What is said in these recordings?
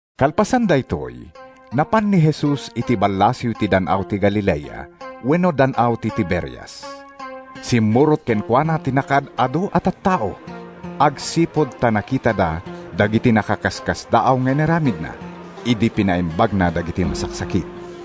Kalpasan daytoy, napan ni Jesus iti ballasiw ti Dan-aw ti Galilea (wenno Dan-aw ti Tiberias). Simmurot kenkuana ti nakaad-adu a tattao, agsipud ta nakitada dagiti nakaskasdaaw nga inaramidna idi pinaimbagna dagiti masaksakit.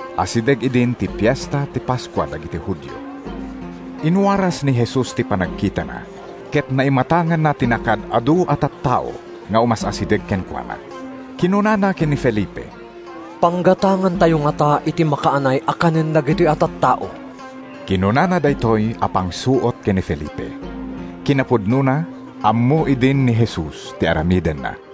Asideg idin ti Fiesta ti Paskua dagiti Judio. Inwaras ni Jesus ti panagkitana ket naimatanganna ti nakaad-adu a tattao nga umas-asideg kenkuana. Kinunana ken ni Felipe, “Panggatangantayo ngata iti makaanay a kanen dagitoy a tattao?” ( Kinunana daytoy a pangsuot ken ni Felipe. Kinapudnona, ammo idin ni Jesus ti aramidenna.)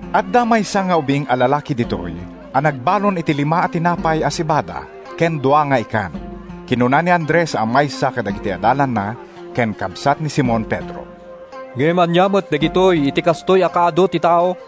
“Adda maysa nga ubing a lalaki ditoy a nagbalon iti lima a tinapay a sebada ken dua nga ikan,” kinuna ni Andres a maysa kadagiti adalanna ken kabsat ni Simon Pedro. “Ngem ania met dagitoy iti kastoy a kaadu ti tao?”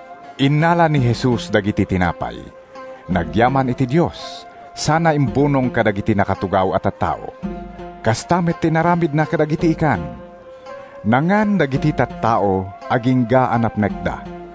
Innala ni Jesus dagiti tinapay, nagyaman iti Dios, sana imbunong kadagiti nakatugaw a tattao. Kasta met ti inaramidna kadagiti ikan. Nangan dagiti tattao agingga a napnekda.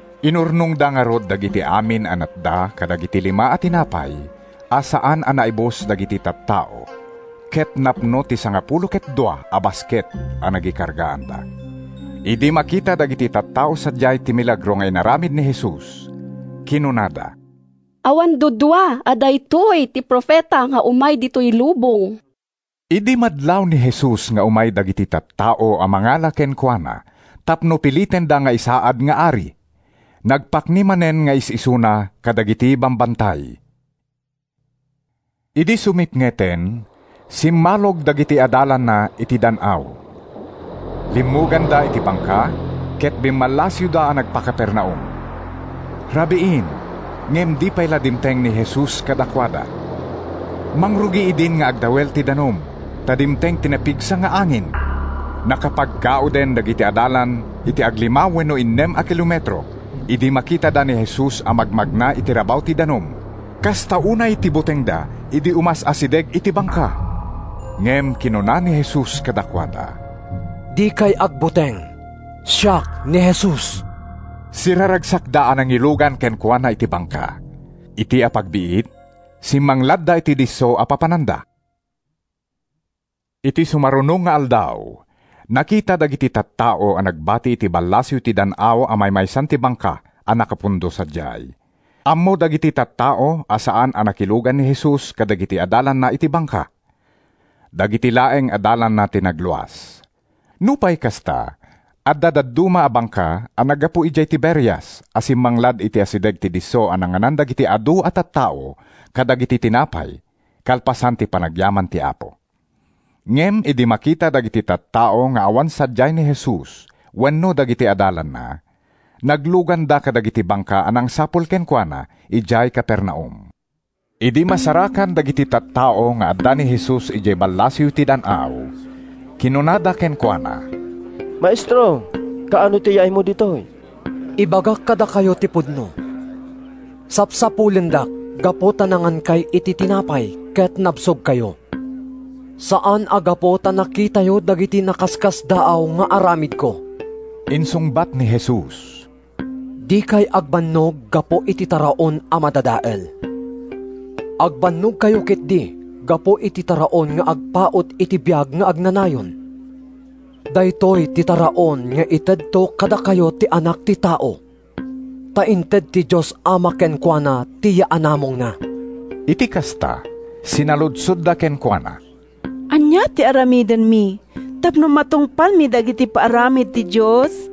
Inurnongda ngarud dagiti amin a natda kadagiti lima a tinapay a saan a naibus dagiti tattao ket napno ti sangapulo ket dua a basket a nagikargaanda. Idi makita dagiti tattao sadiay ti milagro nga inaramid ni Jesus, kinunada, “Awan duadua a daytoy ti Profeta nga umay ditoy lubong!” Idi madlaw ni Jesus nga umay dagiti tattao a mangala kenkuana tapno pilitenda nga isaad nga ari, nagpakni manen nga is-isuna kadagiti bambantay. Idi sumipngeten, simmalog dagiti adalanna iti dan-aw. Limmuganda iti bangka, ket bimmallasiwda a nagpa-Capernaum. Rabiin, ngem di pay la dimteng ni Jesus kadakuada. Mangrugi idin nga agdawel ti danum, ta dimteng ti napigsa nga angin. Nakapaggauden dagiti adalan iti aglima wenno innem a kilometro idi makitada ni Jesus a magmagna iti rabaw ti danum. Kasta unay ti butengda idi umas-asideg iti bangka. Ngem kinuna ni Jesus kadakuada, “Dikay agbuteng, siak ni Jesus!” Siraragsakda a nangilugan kenkuana iti bangka. Iti apagbiit, simmangladda iti disso a papananda. Iti sumaruno nga aldaw, nakita dagiti tattao a nagbati iti ballasiw ti dan-aw a maymaysan ti bangka a nakapundo sadiay. Ammo dagiti tattao a saan a nakilugan ni Jesus kadagiti adalanna iti bangka. Dagiti laeng adalanna ti nagluas. Nupay kasta, adda dadduma a bangka a naggapu idiay Tiberias a simmanglad iti asideg ti disso a nanganan dagiti adu a tattao kadagiti tinapay kalpasan ti panagyaman ti Apo. Ngem idi makita dagiti tattao nga awan sadiay ni Jesus wenno dagiti adalanna, nagluganda kadagiti bangka a nangsapul kenkuana idiay Capernaum. Idi masarakan dagiti tattao nga adda ni Jesus idiay ballasiw ti dan-aw, kinunada kenkuana, “Maestro, kaano ti yaaymo ditoy?” “Ibagak kadakayo ti pudno: Sapsapulendak gapu ta nangankay iti tinapay ket nabsogkayo, saan a gapu ta nakitayo dagiti nakaskasdaaw nga aramidko,” insungbat ni Jesus. “Dikay agbannog gapu iti taraon a madadael. Agbannogkayo ketdi gapu iti taraon nga agpaut iti biag nga agnanayon. Daytoy ti taraon nga itedto kadakayo ti Anak ti Tao, ta inted ti Dios Ama kenkuana ti yaanamongna.” Iti kasta, sinaludsodda kenkuana, “Ania ti aramidenmi tapno matungpalmi dagiti paaramid ti Dios?”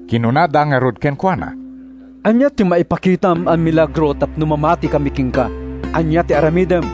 Kinunada ngarud kenkuana: “Ania ti maipakitam a milagro tapno mamatikami kenka? Ania ti aramidem?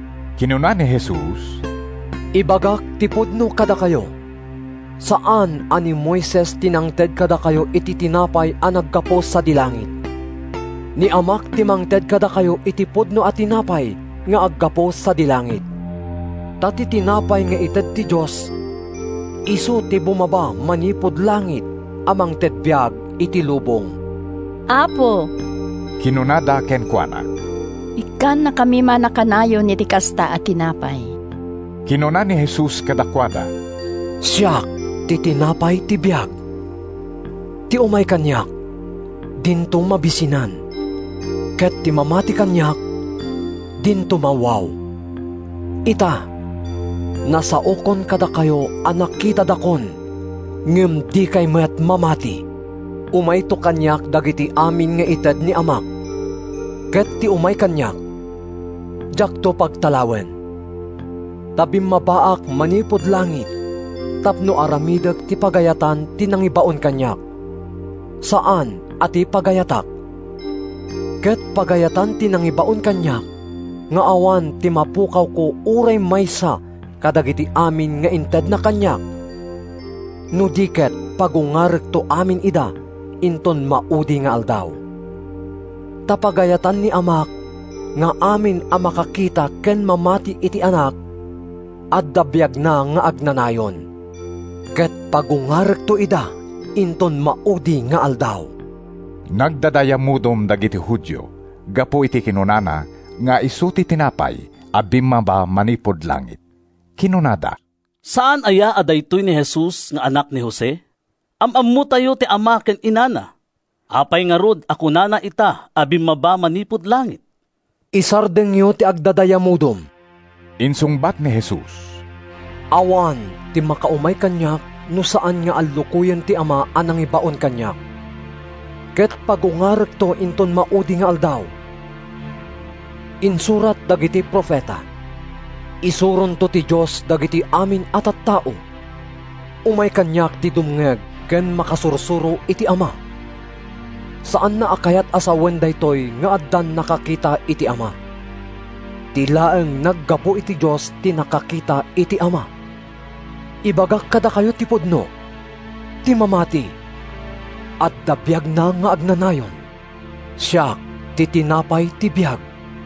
Kinuna ni Jesus, “Ibagak ti pudno kadakayo: Saan a ni Moises ti nangted kadakayo iti tinapay a naggapu sadi langit. Ni Amak ti mangted kadakayo iti pudno a tinapay nga aggapu sadi langit. Ta ti tinapay nga ited ti Dios isu ti bumaba manipud langit a mangted biag iti lubong.” “Apo,” kinunada kenkuana, “ikkannakami man a kanayon iti kasta a tinapay.” Kinuna ni Jesus kadakuada, “Siak ti tinapay ti biag. Ti umay kaniak, dinto mabisinan, ket ti mamati kaniak, dinto mawaw. “Ita, nasaokon kadakayo a nakitadakon ngem dikay met mamati. Umayto kaniak dagiti amin nga ited ni Amak. Ket ti umay kaniak, diakto pagtalawen. Ta bimmabaak manipud langit tapno aramidek ti pagayatan ti nangibaon kaniak, saan a ti pagayatak. Ket pagayatan ti nangibaon kaniak nga awan ti mapukawko uray maysa kadagiti amin nga intedna kaniak, no di ket pagungarekto amin ida inton maudi nga aldaw. Ta pagayatan ni Amak nga amin a makakita ken mamati iti Anak adda biagna nga agnanayon. Ket pagungarekto ida inton maudi nga aldaw.” Nagdadayamudom dagiti Judio gapu iti kinunana nga isu ti tinapay a bimmaba manipud langit. Kinunada, “Saan aya a daytoy ni Jesus nga anak ni Jose? Am-ammotayo ti ama ken inana. Apay ngarud a kunana ita a bimmaba manipud langit?” “Isardengyo ti agdadayamudom,” insungbat ni Jesus. “Awan ti makaumay kaniak no saan nga allukoyen ti Ama a nangibaon kaniak; ket pagungarekto inton maudi nga aldaw. Insurat dagiti profeta: ‘Isuronto ti Dios dagiti amin a tattao.’ Umay kaniak ti dumngeg ken makasursuro iti Ama. Saanna a kayat a sawen daytoy nga addan nakakita iti Ama. Ti laeng naggapu iti Dios ti nakakita iti Ama. “Ibagak kadakayo ti pudno: Ti mamati adda biagna nga agnanayon. Siak ti tinapay ti biag.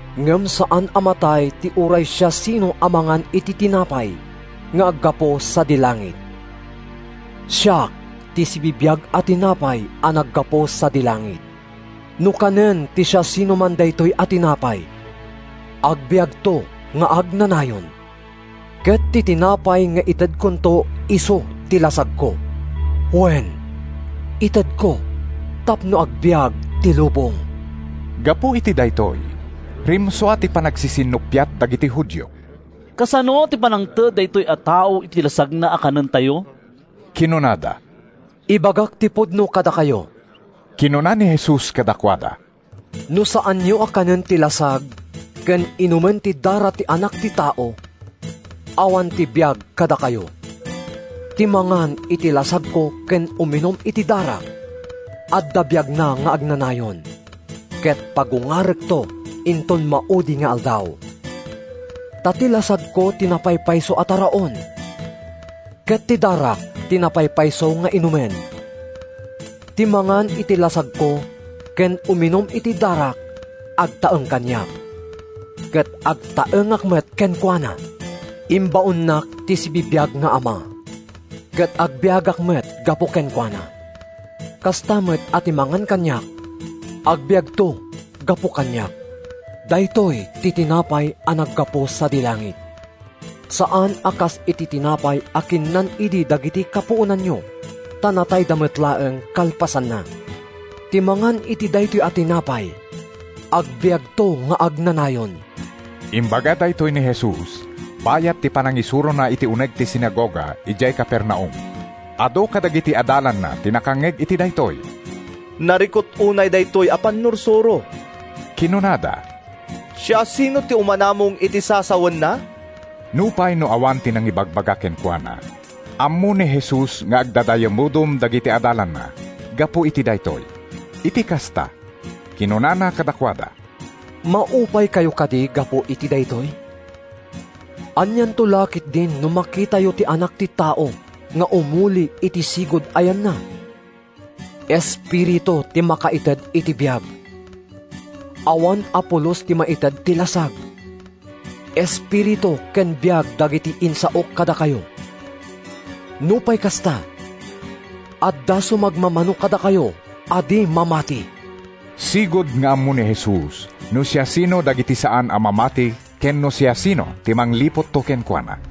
Ngem saan a matay ti uray siasino a mangan iti tinapay nga aggapu sadi langit. Siak ti sibibiag a tinapay a naggapu sadi langit. No kanen ti siasinoman daytoy a tinapay, agbiagto nga agnanayon. Ket ti tinapay nga itedkonto isu ti lasagko. Wen, itedko tapno agbiag ti lubong.” Gapu iti daytoy, rimsua ti panagsisinnuppiat dagiti Judio. “Kasano ti pannangted daytoy a tao iti lasagna a kanentayo?” kinunada. “Ibagak ti pudno kadakayo,” kinuna ni Jesus kadakuada. “No saanyo a kanen ti lasag ken inumen ti dara ti Anak ti Tao, awan ti biag kadakayo. Ti mangan iti lasagko ken uminum iti darak, adda biagna nga agnanayon, ket pagungarekto inton maudi nga aldaw. Ta ti lasagko ti napaypayso a taraon, ket ti darak ti napaypayso nga inumen. Ti mangan iti lasagko ken uminum iti darak agtaeng kaniak, ket agtaengak met kenkuana. Imbaonnak ti sibibiag nga Ama, ket agbiagak met gapu kenkuana. Kasta met a ti mangan kaniak, agbiagto gapu kaniak. Daytoy ti tinapay a naggapu sadi langit: Saan a kas iti tinapay a kinnan idi dagiti kapuonanyo ta natayda met laeng kalpasanna. Ti mangan iti daytoy a tinapay, agbiagto nga agnanayon.” Imbaga daytoy ni Jesus bayat ti panangisurona iti uneg ti sinagoga idiay Capernaum. Adu kadagiti adalanna ti nakangngeg iti daytoy. “Narikut unay daytoy a pannursuro,” kinunada. “Siasino ti umanamong iti sasawenna?” Nupay no awan ti nangibagbaga kenkuana, ammo ni Jesus nga agdadayamudom dagiti adalanna gapu iti daytoy. Iti kasta, kinunana kadakuada: “Maupaykayo kadi gapu iti daytoy? Anianto la ketdin no makitayo ti Anak ti Tao nga umuli iti sigud a yanna? Ti Espiritu ti makaited iti biag. Awan a pulos ti maited ti lasag. Espiritu ken biag dagiti insaok kadakayo. Nupay kasta, adda sumagmamano kadakayo a di mamati.” (Sigud nga ammo ni Jesus no siasino dagiti saan a mamati ken no siasino ti mangliputto kenkuana.)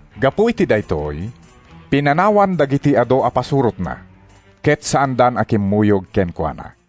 Gapu iti daytoy, pinanawan dagiti adu a pasurotna ket saandan a kimmuyog kenkuana.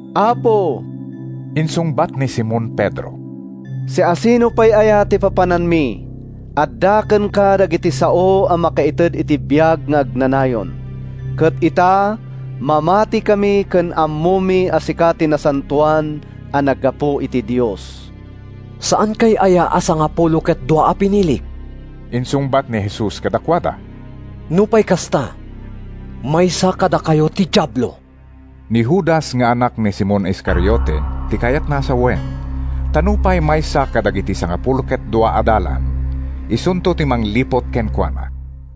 “Apo,” insungbat ni Simon Pedro, “siasino pay aya ti papananmi? Adda kenka dagiti sao a makaited iti biag nga agnanayon. Ket ita, mamatikami ken ammomi a sika ti Nasantoan a naggapu iti Dios.” “Saankay aya a sangapulo ket dua a pinilik?” insungbat ni Jesus kadakuada. “Nupay kasta, maysa kadakayo ti diablo.” Ni Judas nga anak ni Simon Iscariote ti kayatna a sawen, ta nupay maysa kadagiti sangapulo ket dua adalan, isunto ti mangliput kenkuana.